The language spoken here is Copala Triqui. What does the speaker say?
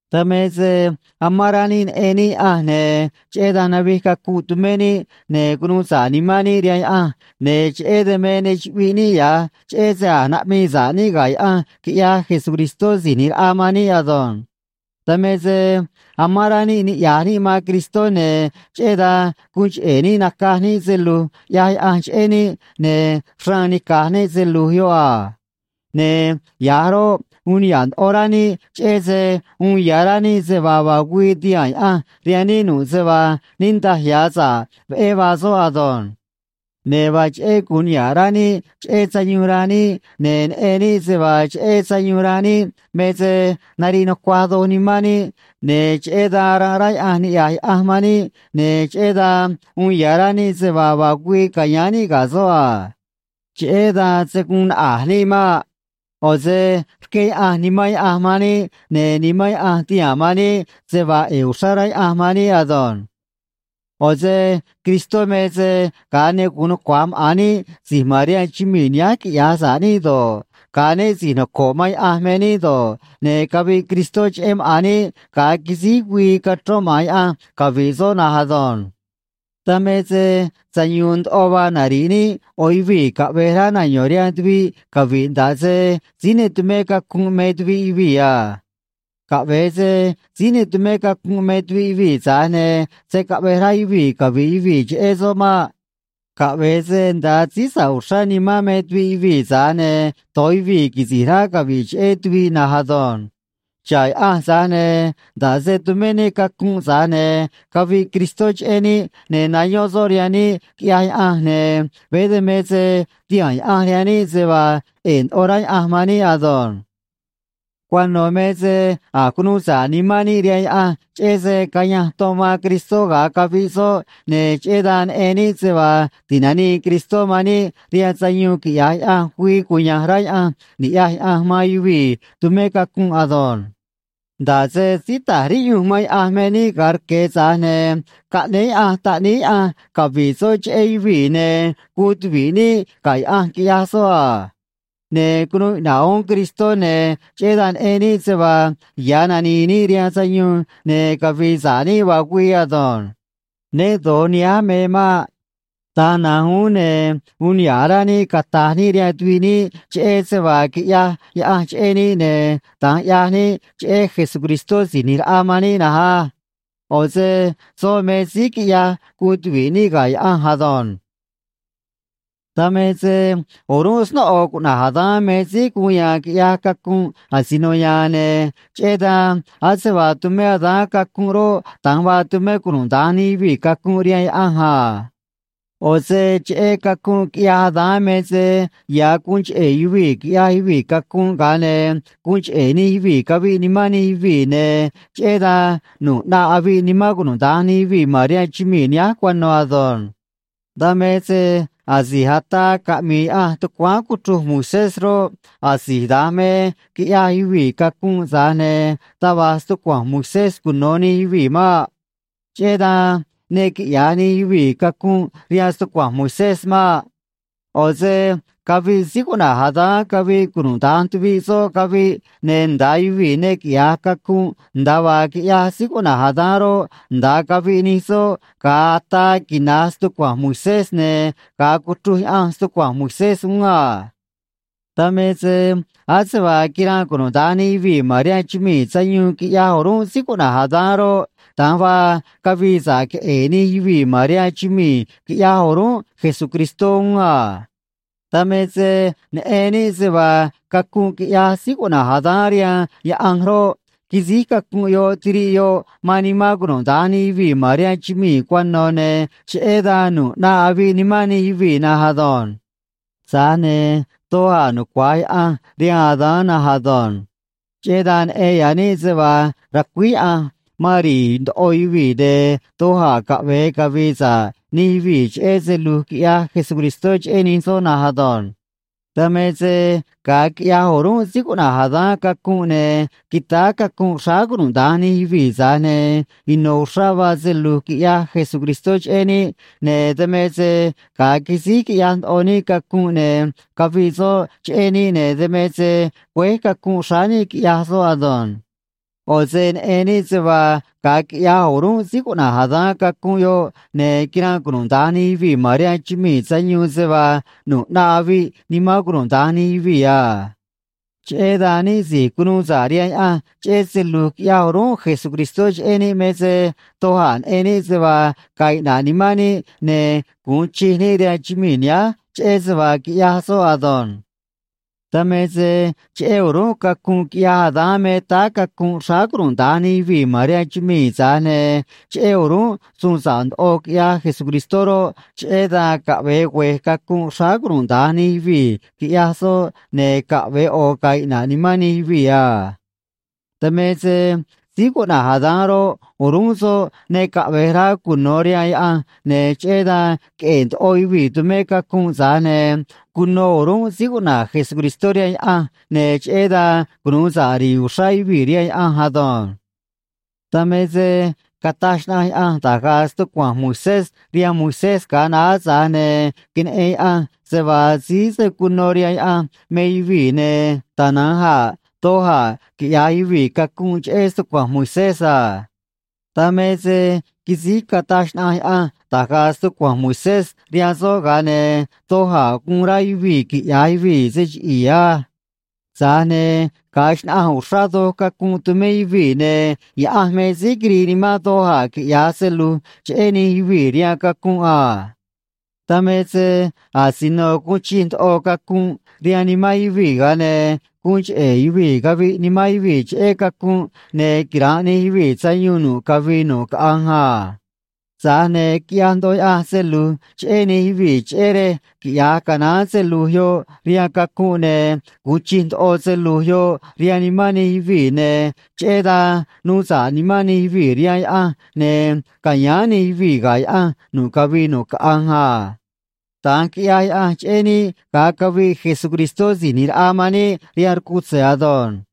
Dan me se amán rá níꞌ neꞌen níꞌ Yaꞌanj, ne̱ cheꞌé dan navij cacunꞌ tumé níꞌ, ne̱ cunuu sa̱ꞌ nimán níꞌ rihaan Yaꞌanj, ne̱ cheꞌé dan me ne chuꞌviꞌ níꞌ ya̱j, cheꞌé se a̱j naꞌmii sa̱ꞌ níꞌ ga̱ Yaꞌanj quiꞌyaj Jesucristó Si̱j ꞌNi̱j Raꞌa man níꞌ ado̱nj. Dan me se amán rá níꞌ niꞌya̱j níꞌ man Cristó, ne̱ cheꞌé dan guun cheꞌe̱ níꞌ nacaj níꞌ se lu̱j ꞌyaj Yaꞌanj cheꞌé níꞌ, ne̱ xraan nica̱j níꞌ se lu̱j yoꞌ a. Ne̱ ya̱j roꞌ, uun niha̱ꞌ ndoꞌo rá níꞌ cheꞌé se uun ya̱ rá níꞌ se vaa vaa güii ti̱haa̱n Yaꞌanj rihaan níꞌ nu̱ꞌ se vaa niꞌndaj ya̱ sa̱ꞌ veꞌé vaa soꞌ ado̱nj. Ne̱ vaa cheꞌé gu̱un niha̱ꞌ rá níꞌ cheꞌé sayuun ranꞌ níꞌ, ne̱ neꞌen níꞌ se vaa cheꞌé sayuun ranꞌ níꞌ me se nariꞌ nucuaj doj nimán níꞌ, ne̱ cheꞌé dan aranꞌ rá Yaꞌanj niꞌya̱j Yaꞌanj man níꞌ, ne̱ cheꞌé dan uun ya̱ rá níꞌ se vaa vaa güii ca̱yáán níꞌ ga̱ soꞌ a. Cheꞌé dan se̱ guun naꞌa̱j níꞌ maꞌ. ꞌO̱ se rqué Yaꞌanj Nimán Yaꞌanj man níꞌ, ne̱ Nimán Yaꞌanj tihaa̱n man níꞌ se vaa ꞌe̱e̱ uxrá rá Yaꞌanj man níꞌ ado̱nj. ꞌO̱ se Cristó me se ga̱a ne gu̱un nucua̱j maꞌa̱n níꞌ si̱j ma̱n rihaan chumii̱ nihánj quiꞌya̱j sa̱ꞌ níꞌ do̱ꞌ, ga̱a né si̱j noco̱ꞌ man Yaꞌanj me níꞌ do̱ꞌ, ne̱ caviꞌ Cristó cheꞌé maꞌa̱n níꞌ, ga̱a quisíj güii cachrón maꞌa̱n Yaꞌanj cavi̱ꞌ soꞌ na̱nj ado̱nj. Dan me se sayu̱u̱n ndoꞌo vaa nari̱ꞌ níꞌ ꞌo̱ yuvii̱ caꞌve̱j rá nayo̱n rihaan tuviꞌ cavi̱ꞌ, nda̱ꞌ se síí ne tumé cacunꞌ me tuviꞌ yuvii̱ a. Caꞌve̱e se síí ne tumé cacunꞌ me tuviꞌ yuvii̱, tza̱j ne̱ se̱ caꞌvej rá yuvii̱ cavi̱ꞌ yuvii̱ cheꞌé soꞌ maꞌ. Caꞌve̱e se nda̱a síí sa̱ꞌ uxrá nimán me tuviꞌ yuvii̱, tza̱j ne̱ do̱j yuvii̱ quisi̱j rá cavi̱ꞌ cheꞌé tuviꞌ na̱nj ado̱nj. Xa̱ꞌ Yaꞌanj, tza̱j ne̱ nda̱ꞌ se tumé níꞌ cacunꞌ, tza̱j ne̱ caviꞌ Cristó cheꞌé níꞌ, ne̱ nayón soꞌ rihaan níꞌ, quiꞌyaj Yaꞌanj, ne̱ veé dan me se tihaa̱n Yaꞌanj rihaan níꞌ se vaa ꞌe̱e̱ ndoꞌo rá Yaꞌanj man níꞌ ado̱nj. Cuano̱ me se a̱j cunuu sa̱ꞌ nimán níꞌ rihaan Yaꞌanj, cheꞌé se cayanj ton man Cristó ga̱a caviꞌ soꞌ, ne̱ cheꞌé dan neꞌen níꞌ se vaa ti̱nanii Cristó man níꞌ rihaan sayuun quiꞌya̱j Yaꞌanj güii cuya̱nj rá Yaꞌanj ni̱ꞌyaj Yaꞌanj man yuvii̱ tumé cacunꞌ ado̱nj. Nda̱ꞌ se síí ta̱j riꞌyunj man Yaꞌanj me níꞌ ga̱a rque̱, tza̱j ne̱ caꞌnéé Yaꞌanj Taꞌníí Yaꞌanj cavi̱ꞌ soꞌ cheꞌé yuvii̱, ne̱ guun tuvi̱ꞌ níꞌ ga̱ Yaꞌanj, quiꞌyaj soꞌ a. Ne̱ cunuu iꞌna̱ꞌ uún Cristó, ne̱ cheꞌé dan neꞌen níꞌ se vaa ya̱ nani̱i̱ níꞌ rihaan sayuun ne̱ cavi̱i̱ sa̱ꞌ níꞌ vaa güii ado̱nj. Ne do̱j nihánj me maꞌ. Da̱nj na̱nj uún ne̱ uun niha̱ꞌ rá níꞌ cata̱j níꞌ rihaan tuviꞌ níꞌ cheꞌé se vaa quiꞌyaj Yaꞌanj cheꞌé níꞌ, ne̱ da̱nj ꞌyaj níꞌ cheꞌé Jesucristó Si̱j ꞌNi̱j Raꞌa man níꞌ na̱nj á. ꞌO̱ se soꞌ me síí quiꞌyaj guun tuvi̱ꞌ níꞌ ga̱ Yaꞌanj ado̱nj. Dan me se o̱rúnꞌ snóꞌo cuꞌna̱j Adán me síí guun ya̱a̱n quiꞌyaj cacunꞌ asino ya̱a̱n, ne̱ cheꞌé dan ase vaa tumé Adán cacunꞌ roꞌ, da̱nj vaa tumé cunuda̱nj nij yuvii̱ cacunꞌ rihaan Yaꞌanj a. ꞌO̱ se cheꞌé cacunꞌ quiꞌyaj Adán me se ya̱ guun cheꞌe̱ yuvii̱ quiꞌyaj yuvii̱ cacunꞌ, ga̱a ne̱ guun cheꞌe̱ nij yuvii̱ caviꞌ nimán nij yuvii̱, ne̱ cheꞌé dan nu̱ꞌ ꞌnaꞌ aviꞌ nimán cunuda̱nj nij yuvii̱ ma̱n rihaan chumii̱ nihánj cuano̱ ado̱nj. Dan me se asi̱j ataa caꞌmi̱i̱ Yaꞌanj tucuáán cuchruj Moisés roꞌ, asi̱j da̱nj me quiꞌyaj yuvii̱ cacunꞌ, tza̱j ne̱ taj va̱j stucua̱nj Moisés cuno̱ nij yuvii̱ maꞌ. Cheꞌé dan ne quiꞌya̱j nij yuvii̱ cacunꞌ rihaan stucua̱nj Moisés maꞌ. ꞌO̱ se caviꞌ síí cuꞌna̱j Adán caviꞌ cunuda̱nj tuviꞌ soꞌ caviꞌ, ne̱ nda̱a yuvii̱ ne quiꞌya̱j cacunꞌ nda̱a vaa quiꞌyaj síí cuꞌna̱j Adán roꞌ, nda̱a caviꞌ nij soꞌ ga̱a ataa quina̱j stucua̱nj Moisés ne̱ ga̱a cuchruj Yaꞌanj stucua̱nj Moisés uún a. Dan me se ase vaa quiranꞌ cunuda̱nj nij yuvii̱ ma̱n rihaan chumii̱ sayuun, quiꞌyaj o̱rúnꞌ síí cuꞌna̱j Adán roꞌ, da̱nj vaa cavii sa̱ꞌ queꞌe̱e̱ nij yuvii̱ ma̱n rihaan chumii̱, quiꞌyaj o̱rúnꞌ Jesucristó uún a. Dan me se neꞌen níꞌ se vaa cacunꞌ quiꞌyaj síí cuꞌna̱j Adán rihaan Yaꞌanj roꞌ, quisíj cacunꞌ yoꞌ tiriꞌ yoꞌ man nimán cunuda̱nj nij yuvii̱ ma̱n rihaan chumii̱ cuano̱, ne̱ cheꞌé dan nu̱ꞌ ꞌnaꞌ aviꞌ nimán nij yuvii̱ na̱nj ado̱nj. Tza̱j ne̱ doj a̱ nucua̱j Yaꞌanj rihaan Adán na̱nj ado̱nj. Cheꞌé dan neꞌen ya̱ níꞌ se vaa ra̱cuíj Yaꞌanj man ri̱i̱ ndoꞌo yuvii̱, ne̱ doj a̱ caꞌve̱e cavi̱i̱ sa̱ꞌ nij yuvii̱ cheꞌé se lu̱j quiꞌyaj Jesucristó cheꞌé nij soꞌ na̱nj ado̱nj. Dan me se ga̱a quiꞌyaj o̱rúnꞌ síí cuꞌna̱j Adán cacunꞌ, ne̱ quitáá cacunꞌ xráá cunuda̱nj nij yuvii̱, tza̱j ne̱ ino̱ uxrá vaa se lu̱j quiꞌyaj Jesucristó cheꞌé níꞌ, ne̱ dan me se ga̱a quisíj quiꞌyaj ndoꞌo níꞌ cacunꞌ ne̱ caviꞌ soꞌ cheꞌé níꞌ, ne̱ dan me se güéj cacunꞌ xráá níꞌ, quiꞌyaj soꞌ ado̱nj. ꞌO̱ se neꞌen níꞌ se vaa ga̱a quiꞌyaj o̱rúnꞌ síí cuꞌna̱j Adán cacunꞌ yoꞌ, ne̱ quiranꞌ cunuda̱nj nij yuvii̱ ma̱n rihaan chumii̱ sayuun se vaa nu̱ꞌ ꞌnaꞌ aviꞌ nimán cunuda̱nj nij yuvii̱ a. Cheꞌé dan níꞌ si̱j cunuu sa̱ꞌ rihaan Yaꞌanj cheꞌé se lu̱j quiꞌyaj o̱rúnꞌ Jesucristó cheꞌé níꞌ me se doj a̱ neꞌen níꞌ se vaa ga̱a̱ iꞌna̱ꞌ nimán níꞌ ne̱ gu̱un chij níꞌ rihaan chumii̱ nihánj cheꞌé se vaa quiꞌyaj soꞌ ado̱nj. Dan me se cheꞌé o̱rúnꞌ cacunꞌ quiꞌyaj Adán me táá cacunꞌ xráá cunuda̱nj nij yuvii̱ ma̱n rihaan chumii̱, tza̱j ne̱ cheꞌé o̱rúnꞌ suun sa̱ꞌ ndoꞌo quiꞌyaj Jesucristó roꞌ, cheꞌé dan caꞌve̱e güe̱j cacunꞌ xráá cunuda̱nj nij yuvii̱, quiꞌyaj soꞌ, ne̱ caꞌve̱e ꞌo̱ ga̱a̱ iꞌna̱ꞌ nimán nij yuvii̱ a. Dan me se síí cuꞌna̱j Adán roꞌ, o̱rúnꞌ soꞌ ne caꞌve̱j rá cuno̱ rihaan Yaꞌanj, ne̱ cheꞌé dan queꞌe̱e̱ ndoꞌo yuvii̱ tumé cacunꞌ, tza̱j ne̱ cuno o̱rúnꞌ síí cuꞌna̱j Jesucristó rihaan Yaꞌanj, ne̱ cheꞌé dan cunu̱u sa̱ꞌ ri̱i̱ uxrá yuvii̱ rihaan Yaꞌanj ado̱nj. Dan me se cataj xnaꞌanj Yaꞌanj da̱j ga̱a̱ stucua̱nj Moisés rihaan Moisés ga̱a naá, tza̱j ne̱ queneꞌen Yaꞌanj se vaa síí se̱ cuno rihaan Yaꞌanj me yuvii̱ ne̱ tana̱nj a̱ doj a̱ quiꞌya̱j yuvii̱ cacunꞌ cheꞌé stucua̱nj Moisés a. Dan me se quisíj cataj xnaꞌanj Yaꞌanj da̱j ga̱a̱ stucua̱nj Moisés rihaan soꞌ, ga̱a ne̱ doj a̱ guun rá yuvii̱ quiꞌya̱j yuvii̱ se chiꞌi̱i̱ á. Tza̱j ne̱ ga̱a xnaꞌanj uxrá doj cacunꞌ tumé yuvii̱, ne̱ Yaꞌanj me síí quirii nimán doj a̱ quiꞌya̱j se lu̱j cheꞌé nij yuvii̱ rihaan cacunꞌ a. Dan me se asino guun chij ndoꞌo cacunꞌ rihaan nimán yuvii̱, ga̱a ne̱ guun cheꞌe̱ yuvii̱ caviꞌ nimán yuvii̱ cheꞌé cacunꞌ, ne̱ quira̱nꞌ nij yuvii̱ sayuun nu̱ꞌ cavii nu̱ꞌ caꞌanj a. Tza̱j ne̱ quiꞌyaj ndoꞌo Yaꞌanj se lu̱j cheꞌé nij yuvii̱, cheꞌé rej quiꞌya̱j canaán se lu̱j yoꞌ rihaan cacunꞌ, ne̱ gu̱un chij ndoꞌo se lu̱j yoꞌ rihaan nimán nij yuvii̱, ne̱ cheꞌé dan nuu sa̱ꞌ nimán nij yuvii̱ rihaan Yaꞌanj, ne̱ ca̱yáán nij yuvii̱ ga̱ Yaꞌanj nu̱ꞌ cavii nu̱ꞌ caꞌanj a. Da̱nj quiꞌyaj Yaꞌanj cheꞌé níꞌ ga̱a caviꞌ Jesucristó Si̱j ꞌNi̱j Raꞌa man níꞌ rihaan rcutze̱ ado̱nj.